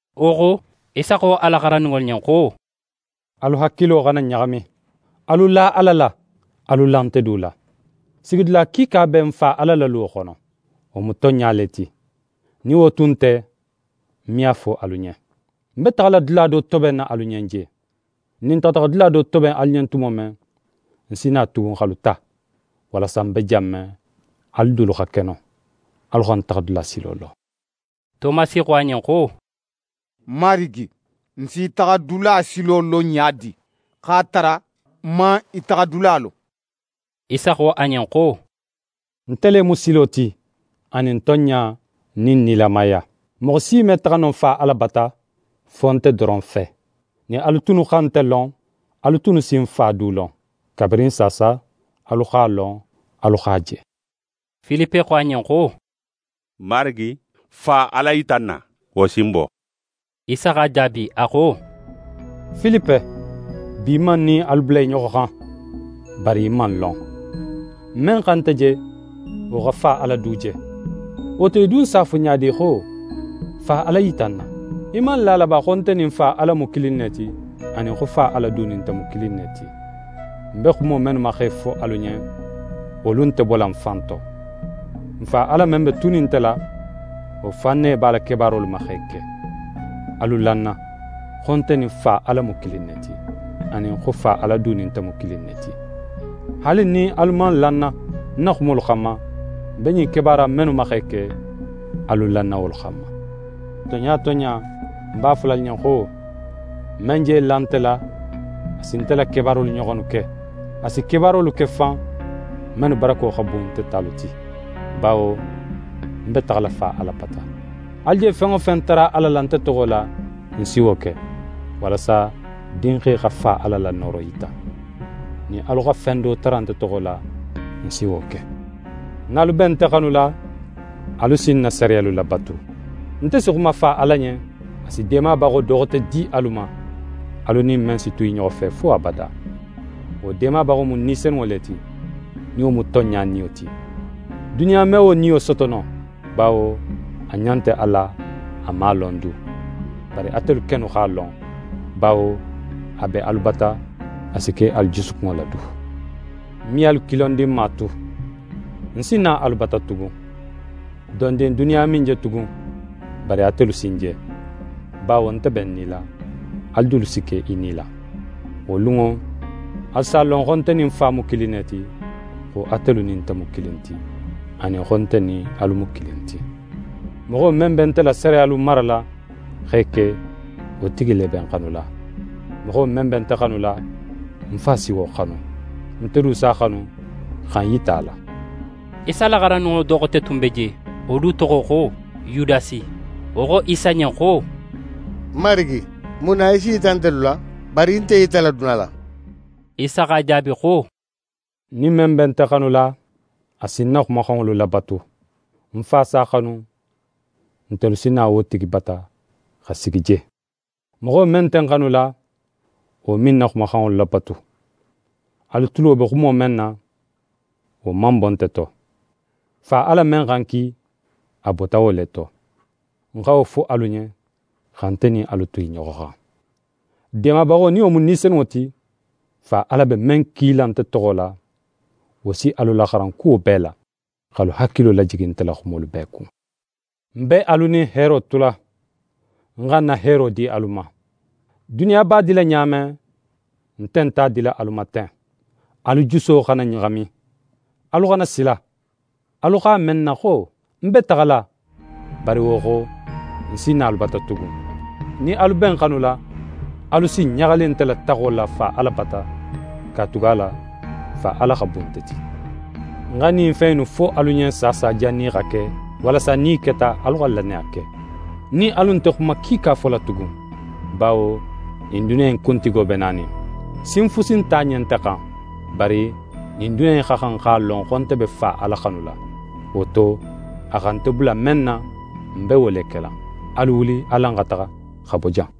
Wo xo, Isa xo a la xarandinŋolu ɲen xo: «Alu hakilo xana ɲaxami. Alu la Ala la, alu la nte du la. Sigidula kiika be ń Fa Ala la luwo xono. Wo mu tonɲa le ti, nin wo tun nte, ń me a fo alu ɲen. Ń be taxala dula do tobenna alu ɲen je. Nin ń taxata xa dula do toben alu ɲen tumo men, ń si na tugun, x'alu ta, walasa ń be jan men, alu dulu xa ke non. Alu xa ń taxadula silo lon.» Tomasi xo a ɲen xo: «Marigi, n s'í taxadula silo lon ɲa di, x'a tara, n man í taxadula lon?» Isa xo a ɲen xo: «Nte le mu silo ti, anin tonɲa nin nilamaya. Moxo si me taxa no Fa Ala bata, fo nte doron fe. Nin alu tunnu xa nte lon, alu tunnu si ń Fa du lon. Kabirin saasa, alu x'a lon, alu x'a je.» Filipe xo a ɲen xo: «Marigi, Fa Ala yita n na, wo si n bo.» Isa x'a jaabi, a xo: «Filipe, bi man ń nin alu bula i ɲoxo xan, bari í man ń lon. Men xa nte je, wo xa Fa Ala du je. Wo to, í dun s'a fo ɲa di xo: “Fa Ala yita n na?” Í man la a la ba, xo nte nin Fa Ala mu kilin ne ti, anin xo Fa Ala du nin nte mu kilin ne ti? Ń be xumo mennu ma x'e fo alu ɲen, wolu nte bola ń fan to. Ń Fa Ala men be tunin nte la, wo fan ne b'a la kebaarolu ma x'e ke. Alu la ń na, xo nte nin Fa Ala mu kilin ne ti, anin xo Fa Ala du nin nte mu kilin ne ti. Haali nin alu man la ń na ń na xumolu xanma, ń be ɲin kebaara innu mennu ma x'e ke, alu la ń na wolu xanma. Tonɲa tonɲa, ń b'a fola alu ɲen xo: Men je la nte la, a si nte la kebaarolu ɲoxonnu ke. A si kebaarolu ke fan, mennu barako xa bun nte talu ti, bawo ń be taxala Fa Ala bata. Alu je fen wo fen tara Ala la, nte toxo la, ń si wo ke, walasa Dinxe xa Fa Ala la nooro yita. Nin alu xa fen do tara nte toxo la, ń si wo ke.» «Nin alu be nte xanula, alu si ń na sariyalu labatu. Nte si xuma Fa Ala ɲen, a si Deemabaxo do xote di alu ma, alu nin men si tu i ɲoxo fe fo abada. Wo Deemabaxo mu Ni Senunŋo le ti, nin wo mu tonɲa Niyo ti. Duniya me wo Niyo soto no, bawo a ɲa nte a la, a man a lon du. Bari atelu kennu x'a lon, bawo a be alu bata, a si ke alu jusukunŋo la du. Ń me alu kilondinma tu. Ń si na alu bata tugun. Dondin duniya me ń je tugun, bari atelu si ń je, bawo nte be ń nila, alu dulu si ke i nila. Wo lunŋo, alu s'a lon, xo nte nin ń Fa mu kilin ne ti, xo atelu nin nte mu kilin ti, anin xo nte nin alu mu kilin ti. «Moxo men be nte la sariyalu marala, x'e ke, wo tigi le be ń xanula. Moxo men be nte xanula, ń Fa si wo xanu. Nte du s'a xanu, xa ń yita a la.» Isa la xarandinŋo do xote tun be je, wo du toxo xo Yudasi, wo xo Isa ɲen xo: «Marigi, mun na í s'í yita ntelu la, bari í nte í yitala duniya la?» Isa x'a jaabi xo: «Nin men be nte xanula, a si ń na xumaxanŋolu labatu. Ń Fa s'a xanu, ntelu si na wo tigi bata, xa sigi je. Moxo men nte ń xanula, wo me ń na xumaxanŋolu labatu. Alu tulo be xumo men na, wo man bo nte to. Fa Ala men xa ń ki, a bota wo le to. Ń xa wo fo alu ɲen, xa nte nin alu tu i ɲoxo xan. Deemabaxo, nin wo mu Ni Senunŋo ti, Fa Ala be men kila nte toxo la, wo si alu laxaran kuwo bee la, x'alu hakilo lajigi nte la xumolu bee kun. «Ń be alu nin heero tula. Ń xa ń na heero di alu ma. Duniya b'a dila ɲa men, nte nt'a dila alu ma ten. Alu juso xana ɲaxami. Alu xana sila. Alu x'a me ń na xo: “Ń be taxala, bari wo xo, ń si na alu bata tugun.” Nin alu be ń xanula, alu si ɲaxali nte la taxo la Fa Ala bata, katugala Fa Ala xa bun nte ti. Ń xa ɲin fen innu fo alu ɲen saasa jannin i xa ke, walasa nin i keta, alu xa lannaya ke. Ń nin alu nte xuma kiika fola tugun, bawo ɲin duniya in kuntigo be nanin. Sin fusi nt'a ɲen nte xan. Bari ɲin duniya in xa xan x'a lon, xo nte be Fa Ala xanula. Wo to, a xa nte bula men na, ń be wo le kela. Alu wuli, alan xa taxa, xa bo jan.»